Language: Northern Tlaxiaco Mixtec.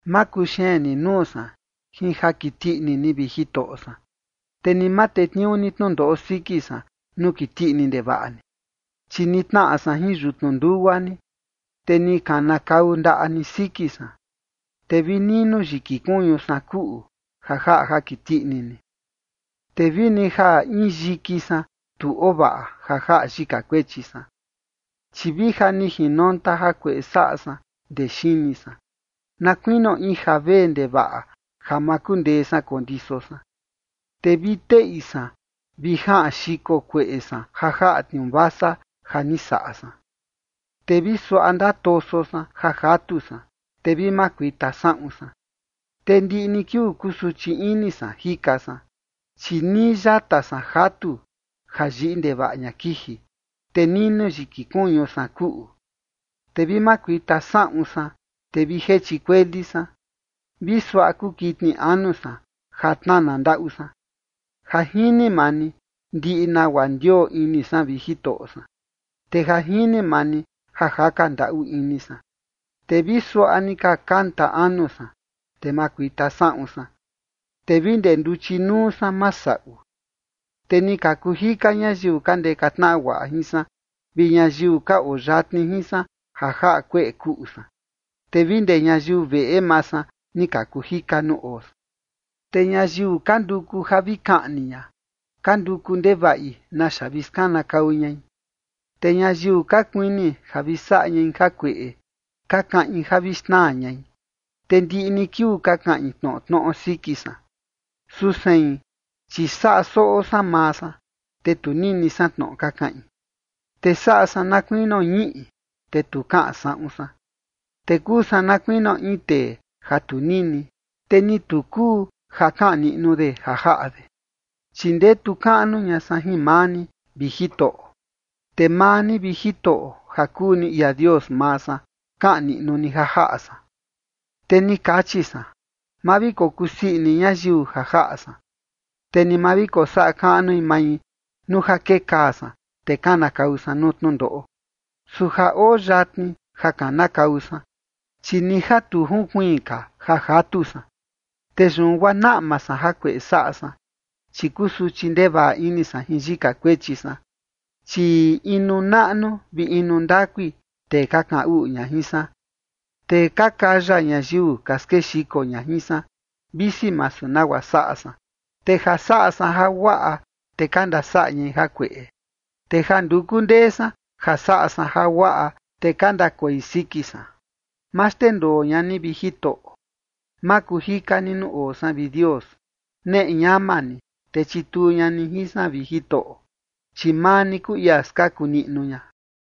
Ma kuxeen ni nuu san jin jakiti ini ni, vi Jitoꞌo san, te ni ma tetniuu ni tnundoꞌo siki san nuu kiti ini ndevaꞌa ni. Chi ni tnaꞌa san jin yutnu ndugua ni, te ni kanakau ndaꞌa ni siki san. Te vi nii nuu yiki kuñu san kuꞌu ja jaꞌa ja kiti ini ni, te vini ja in yiki san tu oo vaꞌa ja jaꞌa yika kuechi san. Chi vi ja ni jinonta jakueꞌe saꞌa san ndee xini san, na kuinio in javee ndevaꞌa ja ma kundee san kondiso san. Te vi teꞌi san vi jaꞌan xiko kueꞌe san ja jaꞌa tniuu vasa ja ni saꞌa san. Te vi suaꞌa ndatoso san ja jatu san, te vi makuita saꞌun san, te ndiꞌi ni kiuu kusuchi ini san jika san. Chi nii yata san jatu ja yiꞌi ndevaꞌa ña kiji, te nii nuu yiki kuñu san kuꞌu. Te vi makuita saꞌun san, te vi jechi kueli san, vi suaꞌa kuu kitni anu san ja tnana ndaꞌu san. Ja jini maa ni ndiꞌi nagua ndioo ini san, vi Jitoꞌo san, te ja jini maa ni ja jaka ndaꞌu ini san. Te vi suaꞌa ni ka kanta anu san, te makuita saꞌun san, te vi ndee nduchi nuu san masaꞌu. Te ni ka kuu jika ñayiu ka ndeka tnaꞌa guaꞌa jin san vi ñayiu ka oo yatni jin san ja jaꞌa kueꞌe kuꞌu san, te vi ndee ñayiu veꞌe maa san ni ka kuu jika nuu oo san. Te ñayiu ka nduku ja vi kaꞌni ña, ka nduku ndevaꞌi naxa vi skanakau ñai, te ñayiu ka kuini ja vi saꞌa ñai jakueꞌe, ka kaꞌin ja vi xnaa ñai, te ndiꞌi ni kiuu ka kaꞌin tnoꞌo tnoꞌo siki san. Su sein, chi saꞌa soꞌo san maa san, te tu nini san tnoꞌo ka kaꞌin, te saꞌa san na kuinio ñiꞌi, te tu kaꞌan saꞌun san. Te kuu san na kuinio in tee ja tu nini, te ni tu kuu ja kaꞌan niꞌnu de ja jaꞌa de. Chi ndetu kaꞌnu ña san jin maa ni, vi Jitoꞌo, te maa ni, vi Jitoꞌo ja kuu ni ia Dios maa san, kaꞌan niꞌnu ni ja jaꞌa san. Te ni kachi san: “Ma vi kokusii ini ñayiu ja jaꞌa san, te ni ma vi kosaꞌa kaꞌnui mai nuu ja kekaa san, te kanakau san nuu tnundoꞌo”. Su ja oo yatni ja kanakau san, chi ni ja tu junkuiin ka ja jatu san. Te yun guaa naꞌma san jakueꞌe saꞌa san, chi kusuchi ndevaꞌa ini san jin yika kuechi san. Chi inu naꞌnu vi inu ndakui tee ka kaꞌan uꞌu ña jin san, te ka kaya ñayiu ka skexiko ña jin san, visi masu nagua saꞌa san. Te ja saꞌa san jaguaꞌa, te ka ndasaꞌa ñai jakueꞌe. Te ja nduku ndee san ja saꞌa san jaguaꞌa, te ka ndakoi siki san. Ma xndendoo ña ni, vi Jitoꞌo. Ma kuu jika ni nuu oo san, vi Dios. Neꞌe ñama ni, te chituu ña ni jin san, vi Jitoꞌo, chi maa ni kuu ia skaku niꞌnu ña.